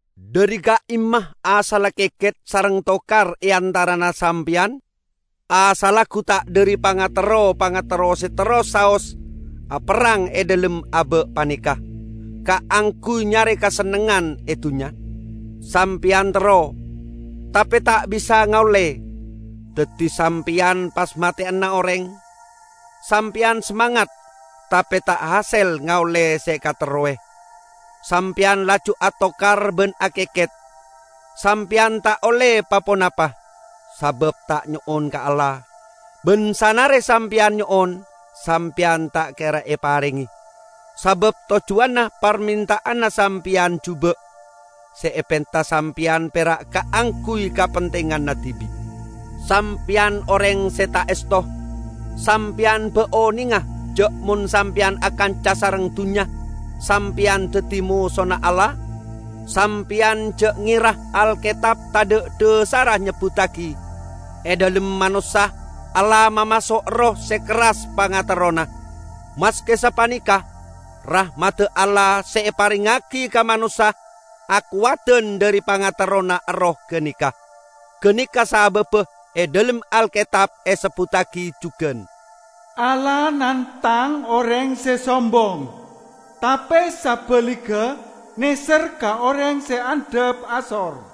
Dhari ka'imma asalla keket sareng tokar e antarana sampeyan? Asalla gu ta' dhari pangaterro-pangaterro se terros saos aperrang e dhalem aba' paneka kaangguy nyare kasennengngan e dunnya? Sampeyan terro, tape ta' bisa ngaolle, daddi sampeyan pas mateyana oreng! Sampeyan samangat, tape ta' ahasel ngaolle se ekaterrowe, sampeyan laju atokar ban akeket. Sampeyan ta' olle pa-ponapa, sabab ta' nyo'on ka Allah. Ban sanare sampeyan nyo'on, sampeyan ta' kera eparenge, sabab tojjuwanna parmenta'anna sampeyan juba'; se epenta sampeyan pera' kaangguy kapentinganna dibi'. Sampeyan oreng se ta' esto! Sampeyan ba' onenga ja' mon sampeyan akanca sareng dunnya sampeyan daddi mosona Allah? Sampeyan ja' ngera Alketab tadha' dhasarra nyebbuttagi, "E dhalem manossa Allah mamaso' erroh se kerras pangaterrona." Maske sapaneka, rahmadda Allah se eparengngagi ka manossa akowadan dhari pangaterrona erroh ganeka. Ganeka sababba e dhalem Alketab esebbuttagi jugan, "Allah nangtang oreng se sombong, tape sabaligga neser ka oreng se andhap asor."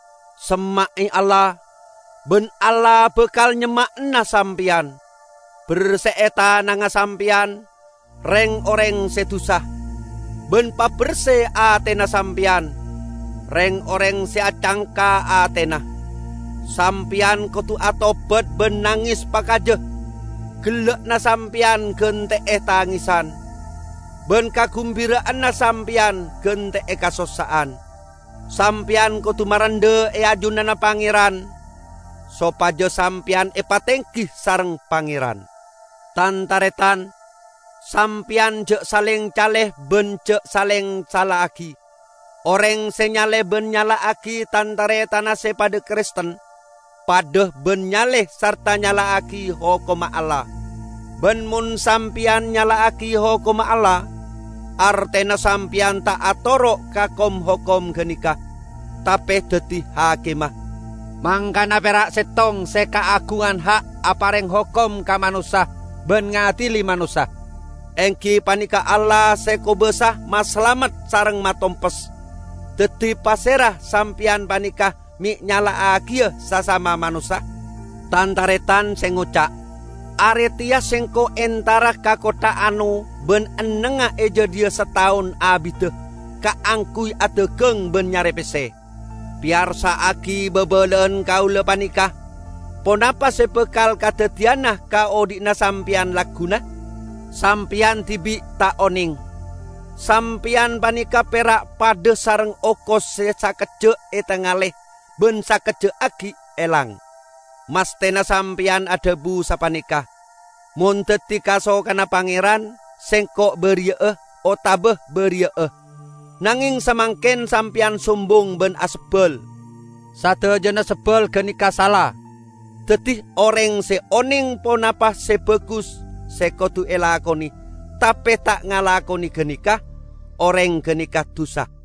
Semma'e Allah, ban Allah bakal nyemma'ana sampeyan. Berse'e tanangnga sampeyan, reng-oreng se dusa! Ban paberse atena sampeyan, reng-oreng se acangka atena! Sampeyan kodu atobat ban nanges pakaja; gella'na sampeyan gante'e tangesan, ban kagumbira'anna sampeyan gante'e kasossa'an! Sampeyan kodu marendha e ajunanna Pangeran, sopaja sampeyan epatenggi sareng Pangeran. Tan-taretan, sampeyan ja' saleng cale ban ja' saleng sala'agi. Oreng se nyale ban nyala'agi tan-taretanna se padha Kristen, padha ban nyale sarta nyala'agi hokomma Allah. Ban mon sampeyan nyala'agi hokomma Allah, artena sampeyan ta' atoro' ka kom-hokom ganeka, tape daddi hakimma. Mangkana pera' settong se kaagungan ha' apareng hokom ka manossa ban ngadili manossa. Enggi paneka Allah se kobasa masalamet sareng matompes. Daddi, pasera sampeyan paneka me' nyala'agiya sasama manossa? Tan-taretan se ngoca', "Are teya sengko' entara ka kottha ano ban ennengnga e jadhiya sataon abidda kaangguy adagang ban nyare pesse," -- peyarsa'agi babala'an kaula paneka. Ponapa se bakal kadaddiyana ka odhi'na sampeyan lagguna, sampeyan dibi' ta' oneng! Sampeyan paneka pera' padha sareng okos se sakejja' etangale ban sakejja' aggi' elang. Masthena sampeyan adhabu sapaneka, "Mon daddi kasokanna Pangeran, sengko' bariya'a otaba bariya'a." Nangeng samangken sampeyan sombong ban asebbal. Sadajana sebbal ganeka sala. Daddi, oreng se oneng ponapa se bagus se kodu elakone tape ta' ngalakone ganeka, oreng ganeka dusa.